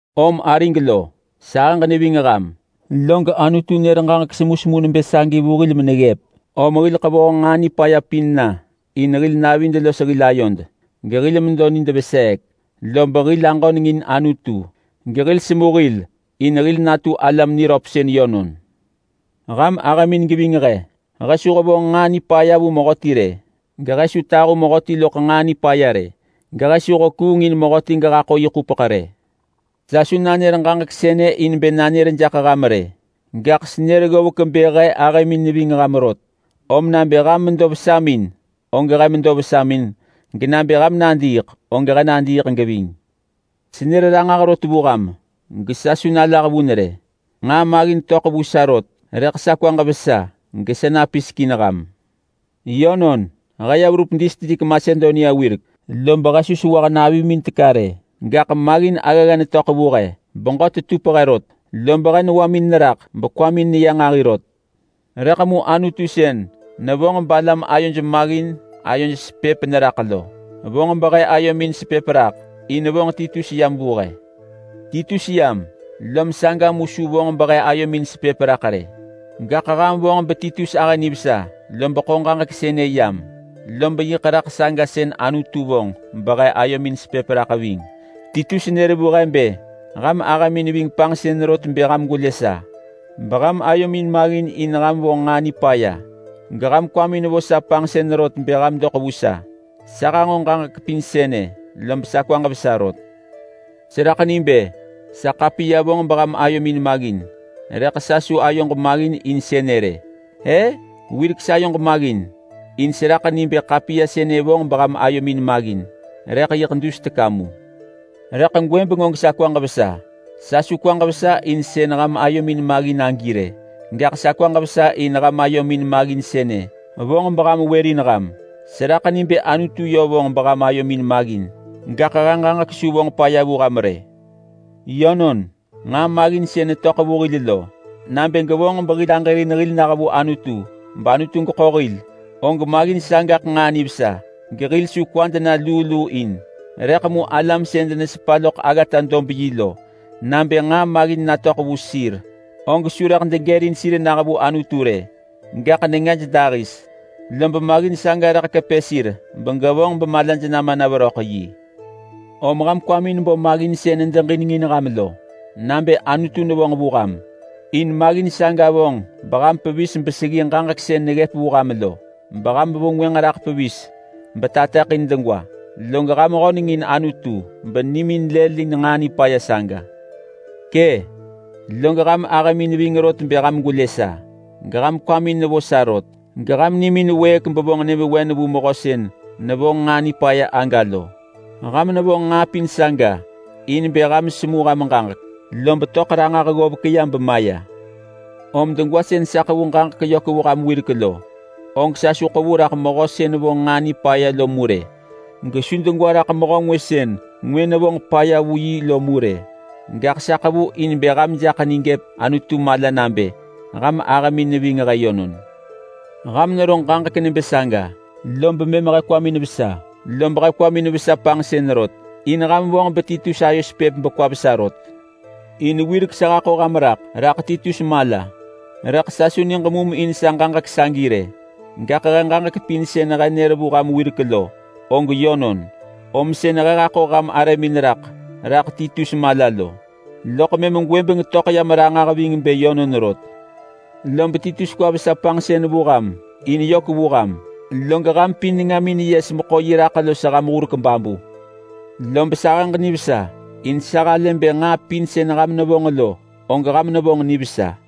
Om arig lo, sahëġ neving ham log Anutu nër ġaġek semusemu nebë sagi vu hil meneggëp. Om hil ḳevoh nġaa nipaya pin na in hil navid los hil ayod gehil medo nid veseek, lob hil aġöneng in Anutu gesemu hil in hil natu alam niröp yönon. Ham ahëmin geving he. He su hevonġ nġaa nipaya vu mehöti rë, gehe su tahu mehöti loḳ nġaa nipaya rë, gehe su hekuung in mehöti gehaḳo yi ḳupeḳ rë. Sa su nanër ġaġek sënë in bë nanër jaḳ ham rë, gaḳ senër ggovek bë he ahëmin neving ham rot. Om nabë ham medo vesamin, og he medo vesamin, genabë ham nadiiḳ, og he nadiiḳ geving. Senër ranġah rot vu ham gesa su nalah vun rë. Nġaa maggin töḳ vu sa rot, rëḳ sa kwaġ vesa gesa napisek in ham. Yönon, he ya verup distrik Masedonia wirek, lob he su nesewah navimin teka rë, gaḳ maggin aggagga netöḳ vu he. Beġö tetup he rot, lob he newamin neraḳ gekwamin neya nġahi rot. Rëḳ mu Anutu sën nevonġ balam ayoj maggin ayoj sepëp neraḳ lo vonġ behe ayomin sepëp raḳ, in vonġ Titus yam vu he. Titus yam, lob saga mu su vonġ behe ayomin sepëp raḳ rë. Gaḳ ham vonġ beTitus ahë nivesa lob ḳo ġaġek sënë yam, lob yiḳ raḳ saga sën Anutu vonġ behe ayomin sepëp raḳ ving. Titus nër vu he bë ham ahëmin ving panġsën rot bë ham gwelë sa, beham ayomin maggin in ham vonġ nġaa nipaya, geham kwamin vo sa panġsën rot bë ham doḳ vu sa. Sa hanġo ġaġek pin sënë, lob sa kwaġ vesa rot. Seraḳ ni bë sa ḳapiya vonġ beham ayomin maggin, rëḳ sa su ayoġ maggin in sënë rë. E! Wirek sayoġ maggin, in seraḳ ni bë ḳapiya sënë vonġ beham ayomin maggin, rëḳ yiḳ dus teka mu. Rëḳ gwëbeng og sa kwaġ vesa. Sa su kwaġ vesa in sën ham ayomin maggin agi rë, gaḳ sa kwaġ vesa in ham ayomin maggin sënë vonġ beham wërin ham. Seraḳ ni bë Anutu yö vonġ beham ayomin maggin, gaḳ he ġaġek su vonġ paya vu ham rë. Yönon, nġaa maggin sën netöḳ vu hil lo, nabë gevonġ behil aġërin hil nah vu Anutu bAnutu geḳo hil, og maggin saga og nġaa nivesa gehil su kwad na luu luu in. Rëḳ mu alam sën denesepa loḳ aggata-dob-yi lo, nabë nġaa maggin natöḳ vu sir, og su rëḳ degërin sir nah vu Anutu rë. Gaḳ nengaj dahis, lob maggin saga nekepë sir benevonġ bemalaj rëḳ nama veröḳ yi. Om ham kwamin bo maggin sën nedeġinengin ham lo nabë Anutu nevonġ vu ham, in maggin saga vonġ beham pevis beseggi ġaġek sën neggëp vu ham lo. Beham vengwënġ raḳ pevis betateḳin degwa, log ham höneng in Anutu benimin lëlin nġaa nipaya saga. Kë, log ham ahëmin ving rot bë ham gwelë sa, geham kwamin nevo sa rot, geham nimin wëëk bevonġ nyëvewen vu mehö sën nevonġ nġaa nipaya aga lo. Ham nevonġ nġaa pin saga in bë ham semu ham ġaġek, lob töḳ ranġah ggovek ya bemaya. Om degwa sën sa ḳevu ġaġek yök vu ham wirek lo, og sa su ḳevu raḳ mehö sën vonġ nġaa nipaya lo mu rë, gesu degwa raḳ mehö ngwë sën ngwë nevonġ paya vu yi lo mu rë, gaḳ sa ḳevu in bë ham jaḳ ni gëp Anutu mala nabë ham ahëmin neving he yönon. Lob ham nero ġaġek nebë saga, lob mëm he kwamin vesa. Lob he kwamin vesa panġsën rot in ham vonġ beTitus ayo sepëp bekwa vesa rot. In wirek sa haḳo ham raḳ rak Titus mala, rëḳ sa su niġ mum in sa ġaġek sagi rë, gaḳ he ġaġek pin sën he nër vu ham wirek lo, og yönon. Om sën he haḳo ham arëmin raḳ rak Titus mala lo, og mëm gwëbeng töḳ yam ranġah ving bë yönon rot. Lob Titus kwa vesa panġsën vu ham in yök vu ham, log ham pin nengamin yes meḳo yi raḳ los ham hurek babu. Lob sahëġ nivesa in sa halë bë nġaa pin sën ham nevonġ lo og ham nevonġ nivesa.